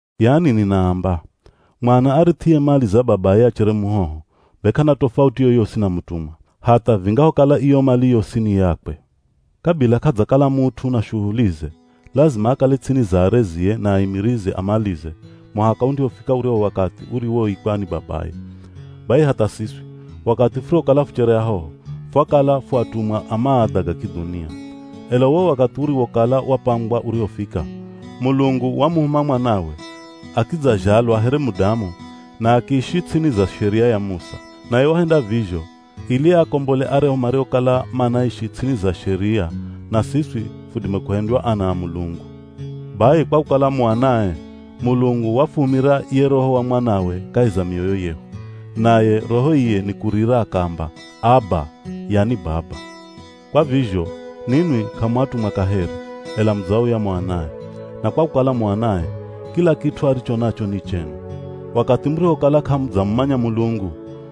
Yani ninaamba: Mwana arith'iye mali za babaye achere muhoho, be k'ana tofauti yoyosi na mutumwa, hatha vingahokala iyo mali yosi ni yakwe. Kabila k'adzakala mut'u na shuhulize, lazima akale ts'ini za arezie na aimirizi a malize muhaka undihofika uryahu wakathi uriwoikwa ni babaye. Bai hatha siswi, wakathi furihokala fuchere ahoho, fwakala fu atumwa a maadha ga kidhunia. Ela uwo wakathi uriwokala wapangwa urihofika, Mulungu wamuhuma Mwanawe, akidzazhalwa here mudamu na akiishi ts'ini za Sheria ya Musa. Naye wahenda vizho ili aakombole aryahu mariokala manaishi ts'ini za Sheria na siswi fudime kuhendywa ana a Mulungu. Bai kwa kukala mu anae, Mulungu wafuhumira ye Roho wa Mwanawe kahi za mioyo yehu. Naye Roho iye nikurira akaamba, “Aba!” yani Baba. Kwa vizho ninwi k'amu atumwa kaheri, ela mudzauya mu anae. Na kwa kukala mu anae, kila kit'u aricho nacho ni chenu. Wakathi murihokala k'amudzamumanya Mulungu,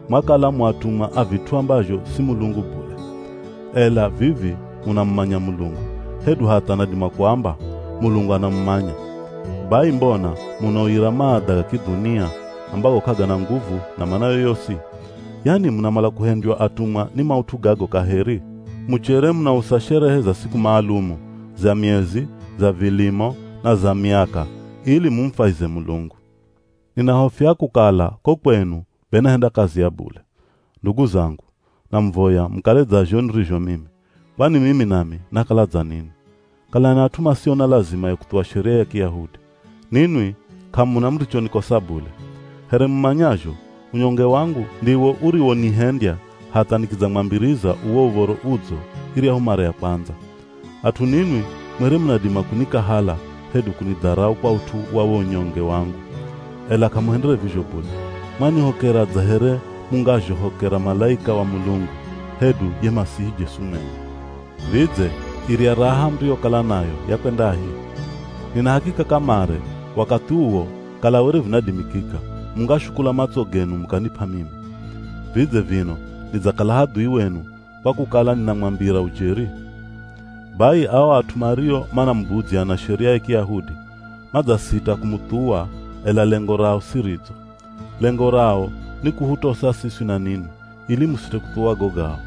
mwakala mu atumwa a vit'u ambazho si Mulungu bule. Ela vivi munamumanya Mulungu, hedu hatha nadima kuamba: Mulungu anamumanya. Bai mbona munauyira maadha ga kidhunia, ambago k'agana nguvu na mana yoyosi? Yani munamala kuhendywa atumwa ni maut'u gago kaheri? Muchere munausa sherehe za siku maalumu, za miezi, za vilimo na za miaka ili mumufwahize Mulungu. Ninahofia kukala ko kwenu be nahenda kazi ya bule. Ndugu zangu, namuvoya mukale dza zho nirizho mimi, kwani mimi nami nakala dza ninwi. Kalani at'u masio na lazima ya kuthuwa Sheria ya Kiyahudi. Ninwi k'amuna murichonikosa bule. Here mumanyazho, unyonge wangu ndiwo uriwonihendya hatha nikidzamwambiriza uwo Uv̱oro Udzo iryahu mara ya kwandza. At'u ninwi mwere munadima kunikahala hedu kunidharau kwa ut'u wa wo unyonge wangu, ela k'amuhendere vizho bule. Mwanihokera dza here mungazhohokera malaika wa Mulungu, hedu ye Masihi Jesu mwenye. Vidze irya raha muriyokala nayo yakwendahi? Nina hakika kamare wakathi uwo kala were vinadimikika, mungashukula matso genu mukanip'a mimi. Vidze vino nidzakala hadhui wenu, kwa kukala ninamwambira ujeri? Bai ao at'u mario manamubudzya na Sheria ya Kiyahudi, madzasita kumuthuwa ela lengo rao si ridzo. Lengo rao ni kuhutosa siswi na ninwi, ili musite kuthuwa go gao.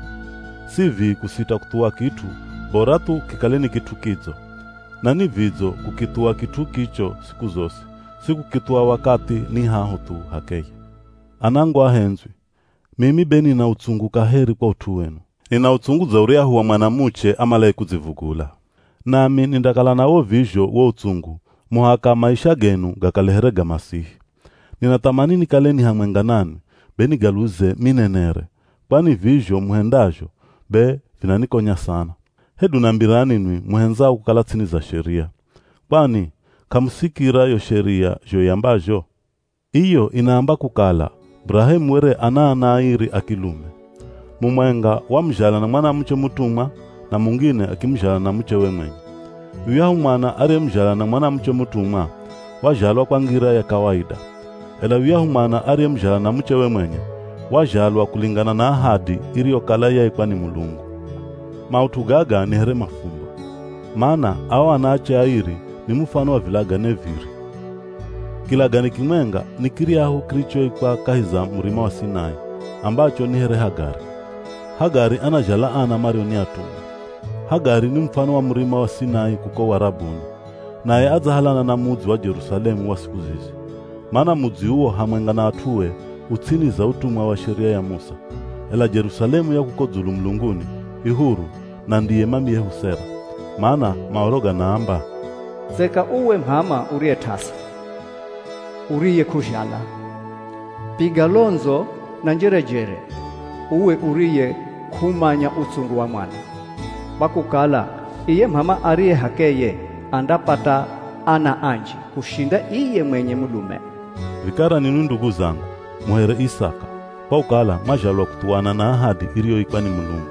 Si vii kusita kuthuwa kit'u, bora thu kikale ni kit'u kidzo. Na ni vidzo kukithuwa kit'u kicho siku zosi, si kukithuwa wakathi ni haho thu h'akeye. Anangu ahendzwi, mimi be nina utsungu kaheri kwa ut'u wenu. Nina utsungu dza uryahu wa mwanamuche amalaye kudzivugula. Nami nindakala nawo vizho wo utsungu muhaka maisha genu gakale here ga Masihi. Ninathamani nikale ni hamwenga nanwi, be nigaluze minenere, kwani vizho muhendazho be vinanikonya sana! Hedu nambirani nwi muhendzao kukala ts'ini za Sheria. Kwani k'amusikira yo Sheria zho iambazho? Iyo inaamba kukala Burahemu were ana ana airi a kilume. Mumwenga wamuzhala na mwanamuche mutumwa, na mungine akimuzhala na muchewe mwenye. Yuyahu mwana ariyemuzhala na mwanamuche mutumwa, wazhalwa kwa ngira ya kawaida. Ela yuyahu mwana ariyemuzhala na muchewe mwenye, wazhalwa kulingana na ahadi iriyokala yaikwa ni Mulungu. Maut'u gaga ni here mafumbo. Mana ao anaache airi ni mufano wa vilagane viri. Kilagane kimwenga ni kiryahu kirichoikwa kahi za Murima wa Sinai, ambacho ni here Hagari. Hagari anazhala ana mario ni atumwa. Hagari ni mufano wa Murima wa Sinai kuko Warabuni. Naye adzahalana na mudzi wa Jerusalemu wa siku zizi. Mana mudzi uwo hamwenga na at'ue u ts'ini za utumwa wa Sheria ya Musa. Ela Jerusalemu ya kuko dzulu mulunguni, i huru, na ndiye mamiyehu Sera. Mana Maoro ganaamba, “Tseka uwe m'ama uriye t'asa, uriyekuzhala! Piga londzo na njerejere, uwe uriye k'umanya utsungu wa mwana. Kwa kukala iye m'ama ariye h'akeye, andapata ana anji kushinda iye mwenye mulume.” Vikara ninwi ndugu zangu, mu here Isaka, kwa kukala mwazhalwa kuthuwana na ahadi iriyoikwa ni Mulungu.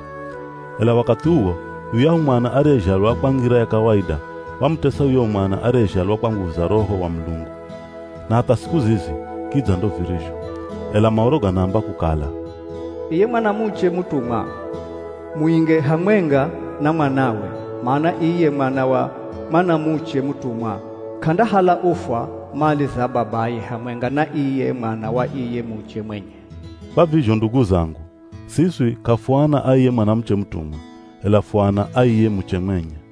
Ela wakathi uwo, yuyahu mwana ariyezhalwa kwa ngira ya kawaida, wamutesa yuyahu mwana ariyezhalwa kwa nguvu za Roho wa Mulungu. Na hatha siku zizi kidza ndo virizho. Ela Maoro ganaamba kukala, “Iye mwanamuche mutumwa, muinge hamwenga na mwanawe, mana iye mwana wa mwanamuche mutumwa k'andahala ufwa mali za babaye hamwenga na iye mwana wa iye muche mwenye.” Kwa vizho ndugu zangu, siswi k'afuana a iye mwanamuche mutumwa, ela fu ana a iye muche mwenye.